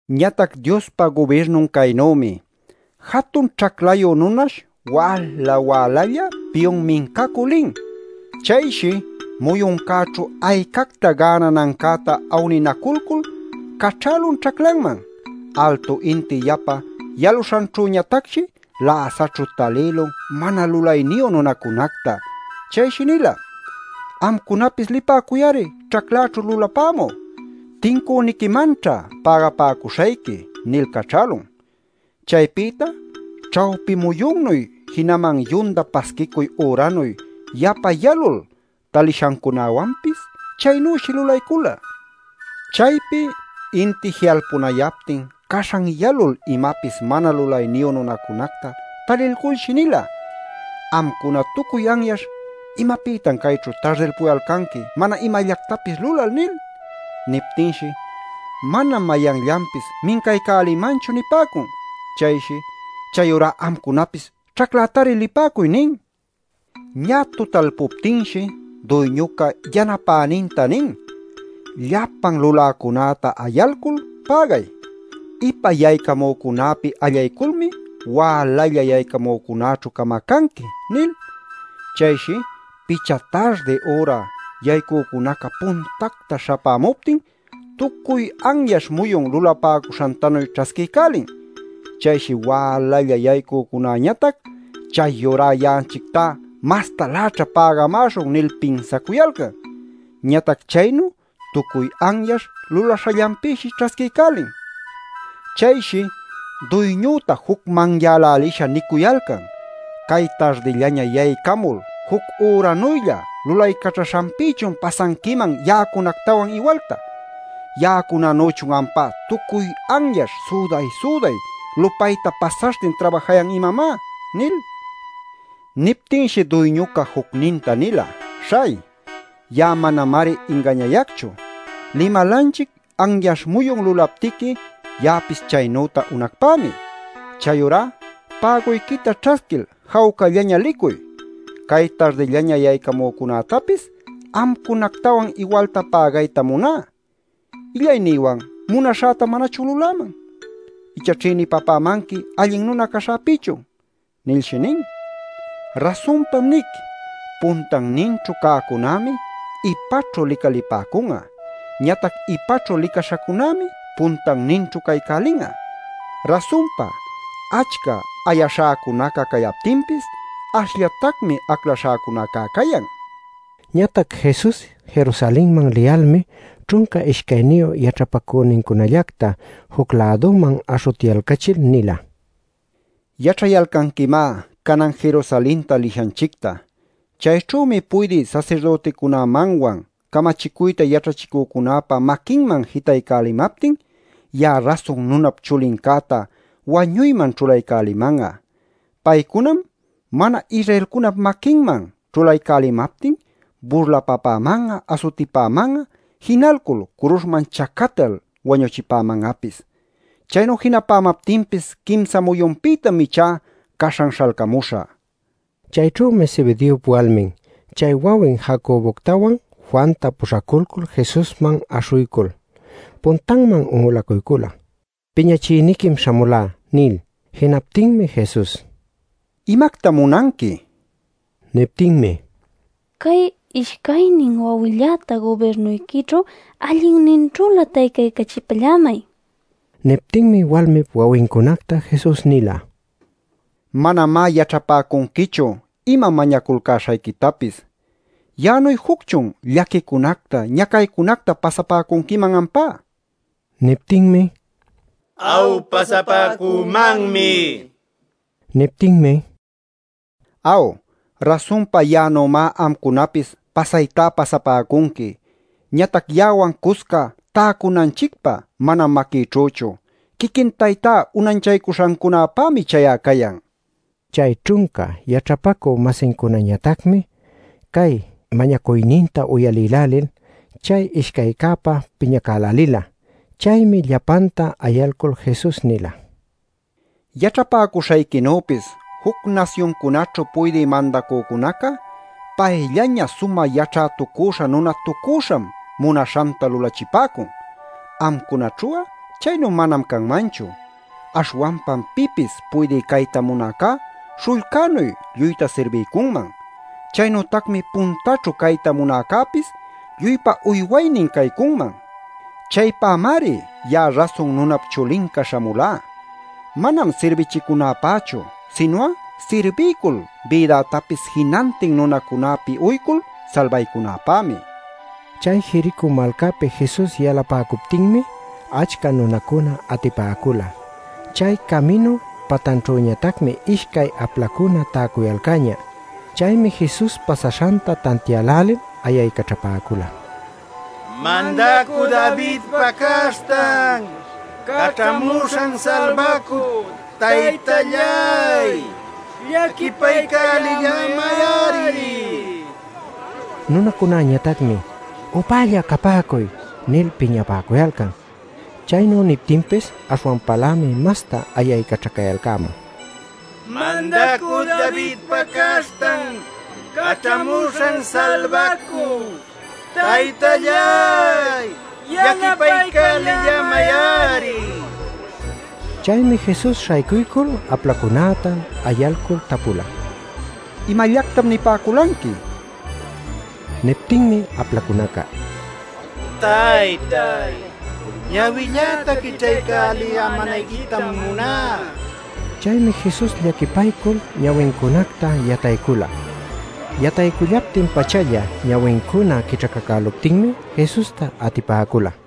“Ñatac Diospa gubirnun caynümi: jatun ćhaclayu nunash wäla wälalla piyun mincacü lin. Chayshi muyuncäćhu aycacta gänanancäta awninaculcul caćhälun ćhaclanman. Altu inti yapa yaluśhanćhüñatacshi läsaćhu talïlun mana lulayniyu nunacunacta. Chayshi nila: ‘Amcunapis lipäcuy-ari ćhacläćhu lulapämü. Tincüniquimanćha pägapäcuśhayqui’ nil caćhälun. Chaypïta ćhawpi muyunnuy jinaman yunda pasquicuy üranuy yapa yalul talishancunawanpis chaynüshi lulaycula. Chaypi inti ji'alpunayaptin caśhan yalul imapis mana lulayniyu nunacunacta talilculshi nila: ‘Amcuna tucuy anyaśh ¿imapïtan cayćhu tardilpuyalcanqui mana imallactapis lulal?’ nil. “Niptinshi: ‘Manam mayanllanpis mincaycälimanchu’ nipäcun. Chayshi: ‘Chayurá amcunapis ćhaclätari lipäcuy’ nin. Ñä tutalpuptinshi, duyñuca yanapäninta nin: ‘Llapan luläcunäta ayalcul pägay. Ipa yaycamücunäpi allayculmi wälalla yaycamücunaćhu camacanqui’ nil. Chayshi picha tardi üra yaycücunaca puntacta śhapämuptin tucuy anyaśh muyun lulapäcuśhantanuy ćhasquiycälin. Chayshi wälalla yaycücunäñatac ‘Chayurá ya'anchictá mastaläćha pägamäśhun’ nil pinsacuyalcan. Ñatac chaynu tucuy anyaśh lulaśhallanpïshi ćhasquiycälin. Chayshi duyñüta jucmanyälälisha nicuyalcan: ‘Cay tardillaña yaycamul juc üranuylla lulaycaćhaśhanpïchun pasanquiman ya'acunactawan iwalta. Ya'acunanüchun ampá tucuy anyaśh süday-süday lupayta pasaśhtin trabajayan imamá’ nil. Niptinshi duyñuca jucninta nila: ‘Śhay, ya'a manamari ingañayacchu. Limalanchic anyaśh muyun lulaptiqui, ya'apis chaynüta unacpämi. Chayurá päguyquita ćhasquil jawcallaña licuy. Cay tardillaña yaycamücunätapis amcunactawan iwalta pägaytam muná. ¿Illaynïwan munaśhäta manachun luläman? ¿Icha ćhïnipapämanqui allin nuna caśhäpïchun?’ nilshi nin. Rasunpam nic: puntanninćhu cäcunämi ipaćhu licalipäcun'a; ñatac ipaćhu licaśhacunämi puntanninćhu caycälin'a. ˻Rasunpa achca ayaśhäcunaca cayaptinpis ashllatacmi aclaśhäcunacá cayan˼” nin. Ñatac Jesus Jerusalenman liyalmi ćhunca ishcayniyu yaćhapacünincunallacta juc-läduman aśhutyalcachil nila: “Yaćhayalcanquimá canan Jerusalenta lishanchicta. Chayćhümi puydï sasirdüticunämanwan, camachicuyta yaćhachicücunäpa maquinman jitaycälimaptin, ya'a Rasun Nunap Chulincäta wañuyman ćhulaycäliman'a. Paycunam mana-Israelcunap maquinman ćhulaycälimaptin, burlapäman'a asutipäman'a, jinalcul curuśhman chacatal wañuchipäman'apis. Chaynu jinapämaptinpis quimsa muyunpïtam ichá caśhan śhalcamuśhä” nil. Chayćhümi Zebedeop walmin chay wawin Jacoboctawan Juanta puśhaculcul Jesusman aśhuycul puntanman un'ulacuycula “Piñachïniquim śhamulá” nil. Jinaptinmi Jesus: “¿Imactam munanqui?” nin. Niptinmi: “Cay ishcaynin wawilläta, gubirnuyquićhu allinninćhülä taycaycachipallämay” nin. Niptinmi walmip wawincunacta Jesus nila: “Manamá yaćhapäcunquichu ima mañaculcäśhayquitapis. ¿Ya'anuy jucchun llaquicunacta ñacaycunacta pasapäcunquiman ampá?” nil. Niptinmi: “Aw, pasapäcümanmi” nipäcula. Niptinmi: “Aw, rasunpa ya'anümá amcunapis pasaytá pasapäcunqui. Ñatac ya'awan cusca täcunanchicpä manam maquïćhüchu. Quiquin Taytá unanchacuśhancunapämi chay'a cayan” nin. Chay ćhunca yaćhapacü-masincunañatacmi cay mañacuyninta uyalïlälil chay ishcaycäpä piñacälälila. Chaymi llapanta ayalcul Jesus nila: “Yaćhapäcuśhayquinüpis juc nasyuncunaćhu puydï mandacücunaca payllaña sumä yaćhätucüśha nunatucüśham munaśhanta lulachipäcun. Amcunaćhu'a chaynu manam canmanchu. Aśhwanpam pipis puydï cayta munäcá śhullcänuy lluyta sirbiycunman. Chaynütacmi puntaćhu cayta munäcäpis lluypa uywaynin caycunman. Chaypämari ya'a Rasun Nunap Chulinca śhamulá: manam sirbichicunäpächu, sinu'a sirbiycul bïdätapis jinantin nunacunäpi uycul salbaycunäpämi” nin. Chay Jericó malcäpi Jesus yalapäcuptinmi achca nunacuna atipäcula. Chay caminu patanćhüñatacmi ishcay aplacuna täcuyalcäñä. Chaymi Jesus pasaśhanta tantiälälil ayaycaćhapäcula: “¡Mandacü Davidpa Caśhtan Caćhamuśhan Salbacü, Taytalláy! ¡Llaquipaycälillämay-ari!” nil. Nunacunañatacmi: “¡Upälla capäcuy!” nil piñapäcuyalcan. Chaynu niptinpis aśhwanpalämi masta ayaycaćhacayalcämun: “¡Mandacü Davidpa Caśhtan Caćhamuśhan Salbacü, Taytalláy! ¡Llaquipaycälillämay-ari!” nil. Chaymi Jesus śhaycuycul aplacunäta ayalcul tapula: “¿Imallactam nipäculanqui?” nil. Niptinmi aplacunaca: “Taytay, ñawilläta quićhaycälillämänayquitam muná” nin. Chaymi Jesus llaquipaycul ñawincunacta yataycula. Yataycullaptin-pachalla ñawincuna quićhacacüluptinmi Jesusta atipäcula.